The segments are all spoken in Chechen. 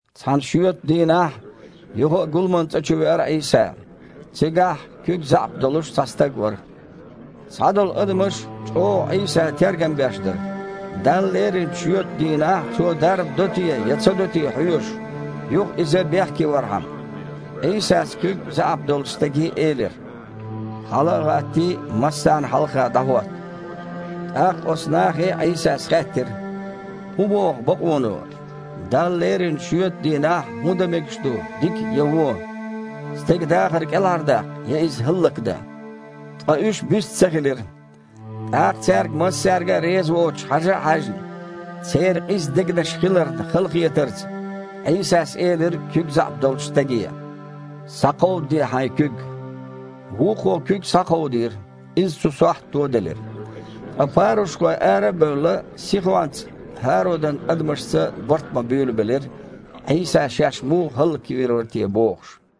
Цхьана шоьтан дийнахь юха а гуламан цІа чу веара Іийса. Цигахь куьг заьІап долуш цхьа стаг вара. Цхьадолу адамаш чІогІа Іийсан тергам беш дара, Далла леринчу шоьтан дийнахь Цо дарба до те я ца до те хьоьжуш, юха Иза бехке вархьама. Іийсас куьг заьІап долчу стаге элира: «Хьала а гІаттий, массарна хьалха дІахІотта». ТІаккха оцу нахе Іийсас хаьттира: «ХІун боху бакъоно, Далла леринчу шоьтан дийнахь хІун дан мегаш ду, дика я вон? Стеган дахар кІелхьардаккха я иза хІаллакдан?» Ткъа уьш бист ца хилира ТІаккха, цаьрга массаьрга а реза воцуш хьажа а хьаьжна, церан къиза дегнаш хиларна халахетарца, Іийсас элира куьг заьІап долчу стаге: «Схьакховдаде хьайн куьг!» Вукхо куьг схьакховдийра – иза оцу сохьта тоделира. Ткъа парушхой, ара а бевлла, сихонца ХІародан адамашца барт бан буьйлабелира, Іийса шаьш муха хІаллаквийр вара те бохуш.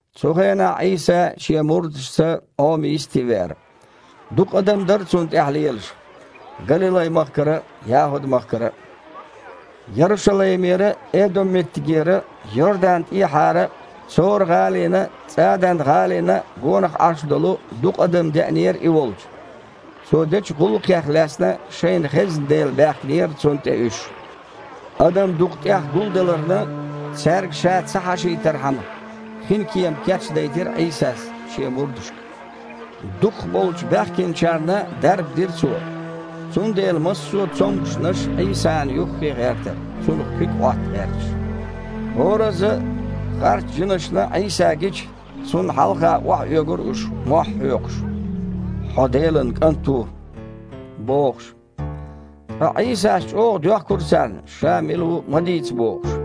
Цу хенахь Іийса Шен мурдашца Іома йисте веара. Дукха адам дара Цунна тІаьхьа лелаш. Галилай-махкара а, ЯхІуд-махкара а, Ярушалаймера а, Эдом-меттигера а, Йорданан тІехьара а, Цора-гІалина а, ЦІадан-гІалина а гонах Іаш долу дукха адам деанера И волчу. Цо дечу гІуллакхех лаьцна шайна хезна дела баьхкинера Цунна тІе уьш. Адам дукха тІех гулдаларна, цаьрга Ша ца хьашийтархьама, хинкема кечдайтира Іийсас Шен мурдашка. Дукхахболчу баьхкинчарна дарба дира Цо, цундела массо а цомгушнаш Іийсана юххе гІертара, Цунах куьг Іотта гІерташ. ХІоразза а харц жинашна Іийса гича, Цунна хьалха охьаоьгура уьш, мохь а хьоькхуш: «Хьо Делан КІант ву!» – бохуш. Ткъа Іийсас чІогІа доьхкура царна, Ша мила ву ма дийца бохуш.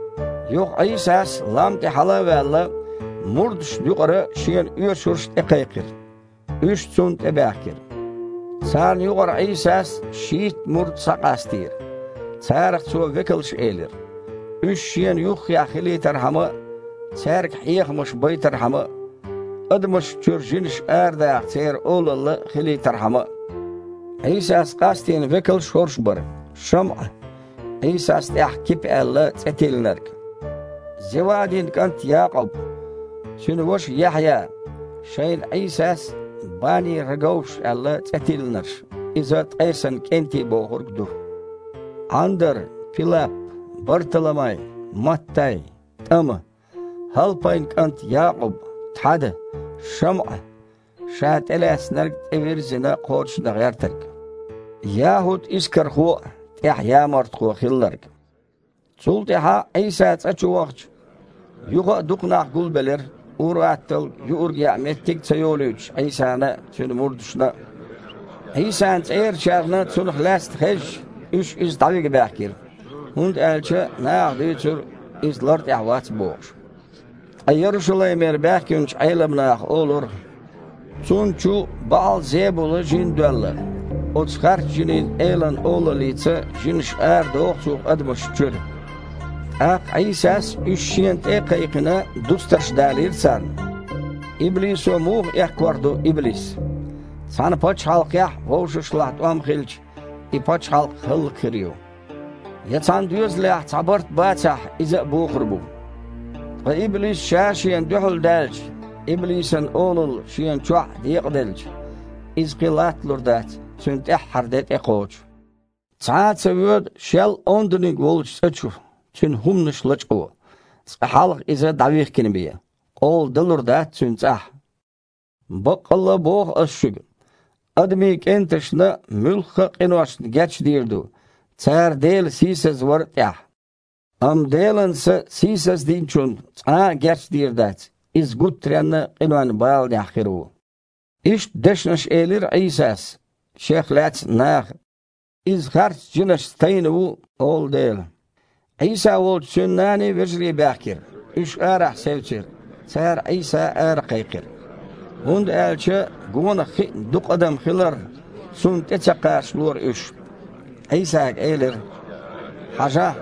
Юха Іийсас, лам тІе хьала а ваьлла, мурдашна юкъара Шена оьшурш тІекхайкхира. Уьш Цунна тІе баьхкира. Царна юкъара Іийсас шийтта мурд схьакъастийра (царах Цо векалш элира), уьш Шена юххехь хилийтархьама а, цаьрга хьехамаш байтархьама а, адамашна чуьра жинаш арадаха церан олалла хилийтархьама а. Іийсас къастийна векалш хІорш бара: ШамІа (Іийсас тІаьхьа, Кипа аьлла, цІе тиллинарг), Зевадин кІант Якъуб, цуьнан ваша Яхьъя, (шайна Іийсас, Баней-Раговш аьлла, цІе тиллинарш, иза «ткъесан кІентий» бохург ду), Іандар, Пилап, Барталамай, Маттай, ТІама, ХІалпайн кІант Якъуб, Тхьада, ШамІа (ша тІелаьцнарг тІевирззина кхочушдан гІертарг), ЯхІуд-Искархо а, тІаьхьа ямартхо хилларг. Цул тІаьхьа Іийса цІа чу вахча, юха а дукха нах гулбелира, ур-атталла юург яа а меттиг ца йолуьйтуш Іийсана а, Цуьнан мурдашна а. Іийсан цІерачарна цунах лаьцна хезча, уьш Иза дІавига баьхкира, хІунда аьлча наха дуьйцура, Иза лар тІехь вац бохуш. Ткъа Ярушалаймера баьхкинчу Іелам наха олура: «Цунна чу БаІал-Зебула-жин доьлла! Оцу харц жинийн элан олаллица жинаш арадоху Цо адамашна чуьра!» ТІаккха Іийсас, уьш Шена тІе а кхайкхина, дустарш далийра царна: «Иблисо муха эккхор ду иблис? Цхьана пачхьалкхехь вовшашлахь тІом хилча, и пачхьалкх хІаллакьхир ю. Я цхьана доьзалехь цхьа барт бацахь, иза а бухур бу. Ткъа иблис ша-шена дуьхьал даьлча, иблисан олалла шена чохь а декъаделча, иза кхин латталур дац, цуьнан тІаьххьара де тІекхочу. Цхьа а ца воьду шел онданиг волчу цІа чу, цуьнан хІуманаш лачкъо, цкъа хьалха иза дІавихкина бен, къола далур дац цуьнан цІахь. Баккъалла а боху Аса шуьга: „Адамийн кІенташна муьлхха а къиношна гечдийр ду, цара Дела сийсазвар а тІехь, амма Делан Са сийсаздинчунна цкъа а гечдийр дац, иза гуттаренна къинойн баланехь хир ву“». Иштта дешнаш элира Іийсас, Шех лаьцна наха «Иза харц жинашца тайна ву», – олу дела. Іийса волчу Цуьнан наний, вежарий баьхкира. Уьш арахь севцира. Цара Іийса аракхайкхира, хІунда аьлча, гонах хиъна дукха адам хиларна, Цунна тІе ца кхачалора уьш. Іийсага элира: «Хьажахь,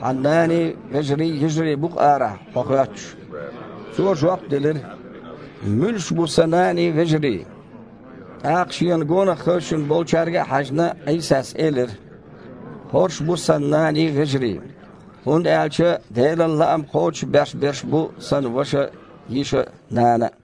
Хьан наний, вежарий, йижарий бу-кх арахь Хьо хоьттуш». Цо жоп делира: «Муьлш бу Сан наний, вежарий?» ТІаккха, Шена гонах хевшина болчаьрга а хьаьжна, Іийсас элира: «ХІорш бу Сан наний, вежарий! ХІунда аьлча Делан лаам кхочушбеш берш бу Сан ваша а, йиша а, нана а».